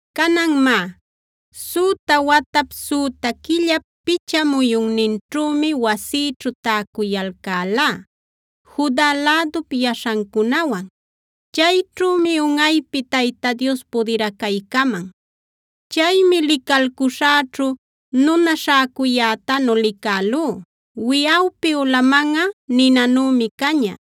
Canan má, süta watap, süta quillap picha muyunninćhümi wasïćhu täcuyalcälá Juda lädup yaśhancunawan. Chayćhümi unꞌaypi Tayta Dios pudiracaycaman. Chaymi licalcuśhäćhu nuna śhäcuyätanu licälú. Wiꞌawpi ulamanꞌa ninanümi caña;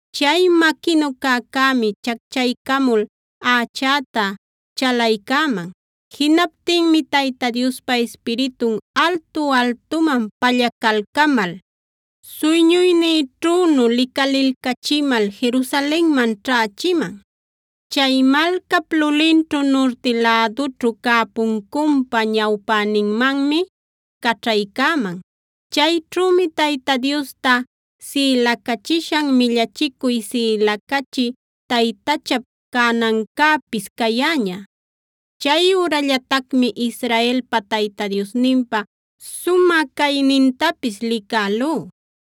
Chay maquinu cäcämi chacchaycamul ächäta chalaycäman. Jinaptinmi Tayta Diospa Ispiritun altu-altuman pallacalcamal, suyñuynïćhünu licalilcachimal Jerusalenman ćhächiman. Chay malcap lulinćhu nurti lädućhu cä puncunpa ñawpäninmanmi caćhaycäman. Chayćhümi Tayta Diosta sïlacachishan millachicuy sïlacachï taytachap canancäpis cayäña. Chay ürallatacmi Israelpa Tayta Diosninpa sumä caynintapis licälú.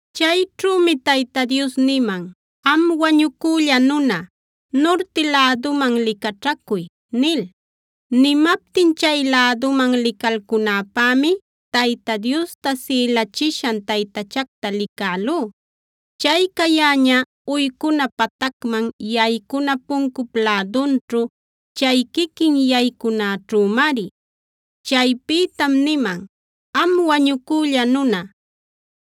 Chayćhümi Tayta Dios niman: “Am wañucülla nuna, nurti läduman licaćhacuy” nil. Nimaptin chay läduman licalcunäpämi Tayta Diosta sïlachishan taytachacta licälú; chay cayäña uycuna patacman yaycuna puncup lädunćhu, chay quiquin yaycunaćhümari. Chaypïtam nimam: “Am wañucülla nuna,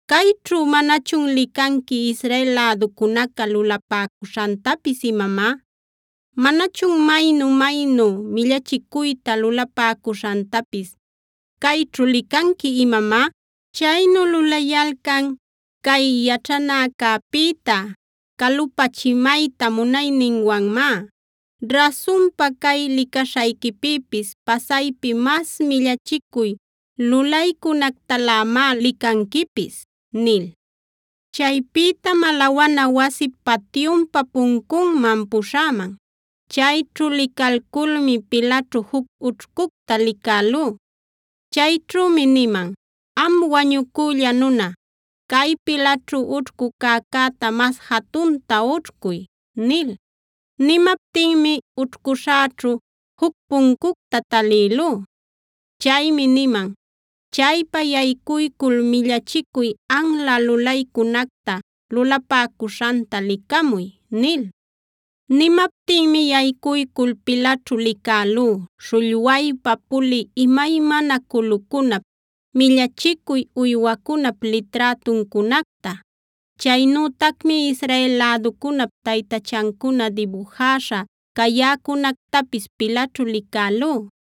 ¿cayćhu manachun licanqui Israel läducunaca lulapäcuśhantapis imamá? ¿Manachun maynu-maynu millachicuyta lulapäcuśhantapis cayćhu licanqui imamá? Chaynu lulayalcan cay yaćhanäcäpïta calupachimayta munayninwanmá. Rasunpa, cay licaśhayquipïpis pasaypi mas millachicuy lulaycunactalämá licanquipis” nil. Chaypïtam alawana wasip patyunpa puncunman puśhäman. Chayćhu licalculmi pilaćhu juc ućhcucta licälú. Chayćhümi niman: “Am wañucülla nuna, cay pilaćhu ućhcu cäcäta mas jatunta ućhcuy” nil. Nimaptinmi ućhcuśhäćhu juc puncucta talïlú. Chaymi niman: “Chaypa yaycuycul millachicuy anla lulaycunacta lulapäcuśhanta licamuy” nil. Nimaptinmi yaycuycul pilaćhu licälú śhullwaypa pulï imaymana culucunap, millachicuy uywacunap liträtuncunacta. Chaynütacmi Israel läducunap taytachancuna dibujäśha cayäcunactapis pilaćhu licälú.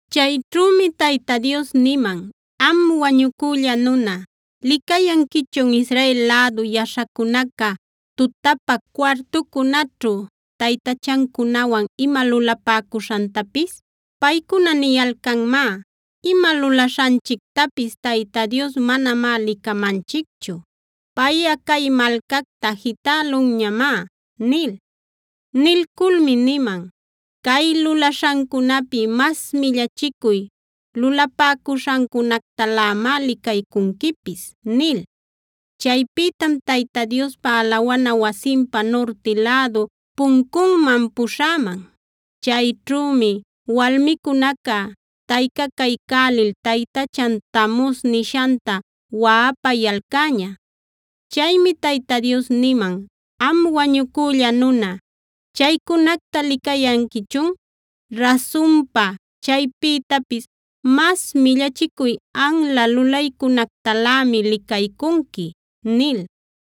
Chayćhümi Tayta Dios niman: “Am wañucülla nuna, ¿licayanquichun Israel lädu yaśhacunaca tutapä cuartucunaćhu taytachancunawan ima lulapäcuśhantapis? Paycuna niyalcanmá: ‘Ima lulaśhanchictapis Tayta Dios manamá licamanchicchu. Payꞌa cay malcacta jitälunñamá’” nil. Nilculmi niman: “Cay lulaśhancunapi mas millachicuy lulapäcuśhancunactalämá licaycunquipis” nil. Chaypïtam Tayta Diospa alawana wasinpa nurti lädu puncunman puśhäman. Chayćhümi walmicunaca taycacaycälil taytachan Tamuzc nishanta waꞌapayalcäña. Chaymi Tayta Dios niman: “Am wañucülla nuna, ¿chaycunacta licayanquichun? Rasunpa, chaypïtapis mas millachicuy anla lulaycunactalämi licaycunqui” nil.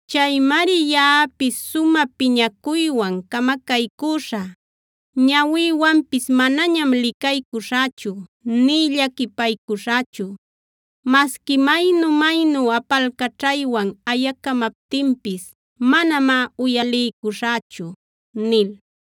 Chaymari yaꞌapis sumä piñacuywan camacaycüśhä. Ñawïwanpis manañam licaycuśhächu nï llaquipaycuśhächu. Masqui maynu-maynu apalcaćhaywan ayacamaptinpis manamá uyaliycuśhächu” nil.